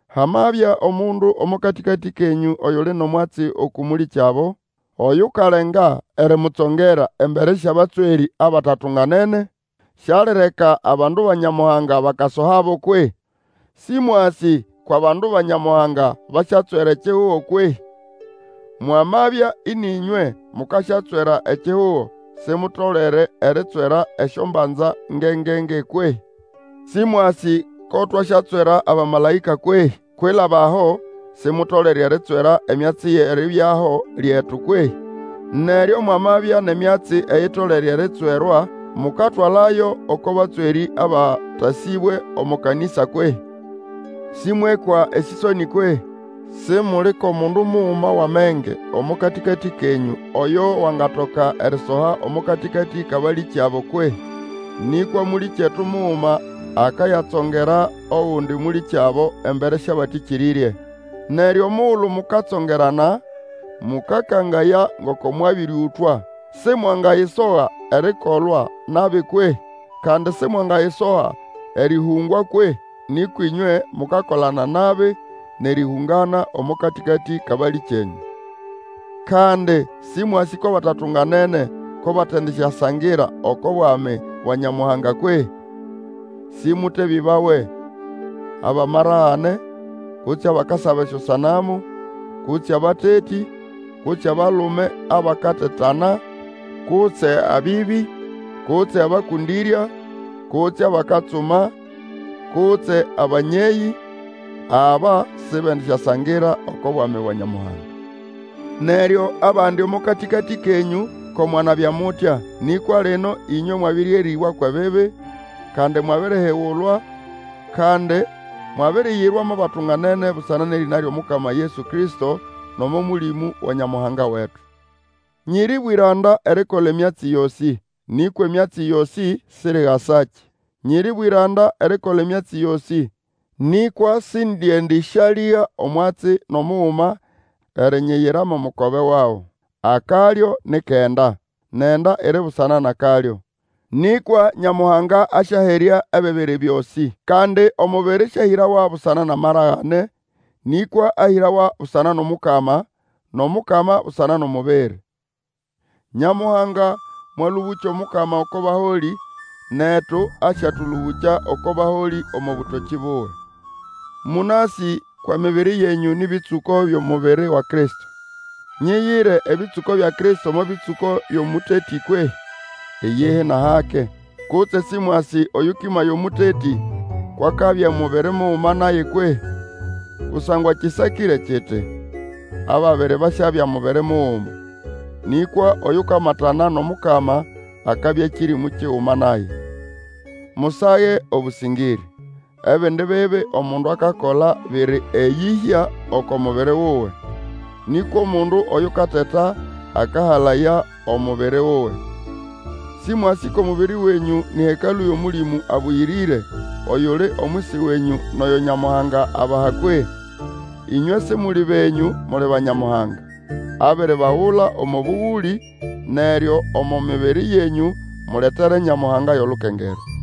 Hamabya omundu omo katĩkatĩ kenyũ oyuli nʼomwatsi uku mũlĩkyabo, oyukalenga erimutsongera embere syʼabatswerĩ abatatunganene, Sialireka abandu ba Nyamuhanga bakasohabo kwehĩ? Sĩmwasĩ kwʼabandu ba Nyamuhanga basyatswera ekihugo kwehĩ? Mwamabya ĩnĩ ĩnywe mukasyatswera ekihugo, Simutolere eritswera esyombanza ngenge-nge kwehĩ? Sĩmwasĩ ko twasyatswera abamalaĩka kwehĩ? Kwilaba aho Simutolere eritswera emyatsi yʼeribyaho lyetu kwehĩ? Neryo mwamabya nʼemyatsi eyitolere eritswerwa, mukatwalayo oko batswerĩ abatasĩbwe omo kanĩsa kwehĩ? Sĩmwekwa esĩsonĩ kwehĩ? Simuli kʼomundu muguma wʼamenge omo katĩkatĩ kenyũ oyo wangatoka erisoha omo katĩkatĩ kʼabalĩkyabo kwehĩ? Nĩkwa mũlĩkyetu muguma akayatsongera ogundi mũlĩkyabo embere syʼabatĩkĩrĩrye. Neryo omugulu mukatsongerana; mũkakangaya ngoko mwabĩrĩũtwa. Simwangayisoga erikolwa nabi kwehĩ? Kandi simwangayisoga erĩhũngwa kwehi? Nĩkwa ĩnywe mukakolana nabi nʼerĩhũngana omo katĩkatĩ kʼabalĩkyenyũ. Kandi sĩmwasĩ kwʼabatatunganene ko batendisyasangira oko bwami bwa Nyamuhanga kwehĩ? Sĩmũtebĩbawe; abʼamaragane, kutse abakasaba esyosanamu, kutse abatetĩ, kutse abalume abakatetana, kutse abĩbĩ, kutse abakũndĩrya, kutse abakatsuma, kutse abanyeyĩ, aba sibendisyasangira oko bwami bwa Nyamuhanga. Neryo abandi omo katĩkatĩ kenyũ ko mwanabya mutya; nĩkwa lino ĩnywe mwabĩrĩerĩbwa kwʼebibi, kandi mwabirihigulwa, kandi mwabiriyirwa mo batunganene busana nʼerĩna lyʼomukama Yesu Kristo, nʼomo Mũlĩmũ wa Nyamuhanga wetu. Nyiri bwĩranda erikola emyatsi yosĩ, nĩkwa emyatsi yosĩ, sirigasakĩ. Nyiri bwĩranda erikola emyatsi yosĩ, nĩkwa Sindiendĩsyalĩga omwatsi nʼomuguma erinyiyira mo mukobe wago. Akalyo ni kʼenda, nʼenda iri busana nʼakalyo; nĩkwa Nyamuhanga asyaherya ebibiri byosĩ. Kandi omubiri sĩahĩrawa busana nʼamaragane, nĩkwa ahĩrawa busana nʼomukama; nʼomukama busana nʼomubiri. Nyamuhanga mwalũbũkya Omukama oko baholĩ, netu asyatũlũbũkya oko baholĩ omo bũtokĩ buwe. Mũnasĩ kwʼemibiri yenyũ nĩ bĩtsũko byʼomubiri wa Kristo. Nyiyire ebĩtsũko bya Kristo mo bĩtsũko byʼomũtetĩ kwehĩ? Iyihi nʼahake! Kutse sĩmwasĩ oyũkĩmaya omũtetĩ kwʼakabya mubiri muguma naye kwehĩ? Kusangwa kĩsakĩre kiti, Ababiri basyabya mubiri muguma. Nĩkwa oyukamatikana nʼomukama akabya kĩrĩmũ kiguma naye. Musage obũsĩngĩrĩ. Ebindi bibi omundu akakola biri eyĩhya oko mubiri wuwe, nĩkwa omundu oyukateta akahalaya omubiri wuwe. Sĩmwasĩ kʼomubiri wenyũ nĩ hekalũ yʼOmũlĩmũ Abũyĩrĩre, oyuli omwisi wenyũ nʼoyo Nyamuhanga abaha kwehĩ? Ĩnywe Simuli benyũ, muli ba Nyamuhanga. Abiribagula omo bũgũlĩ. Neryo omo mibiri yenyũ, muletere Nyamuhanga yʼolukengerwa.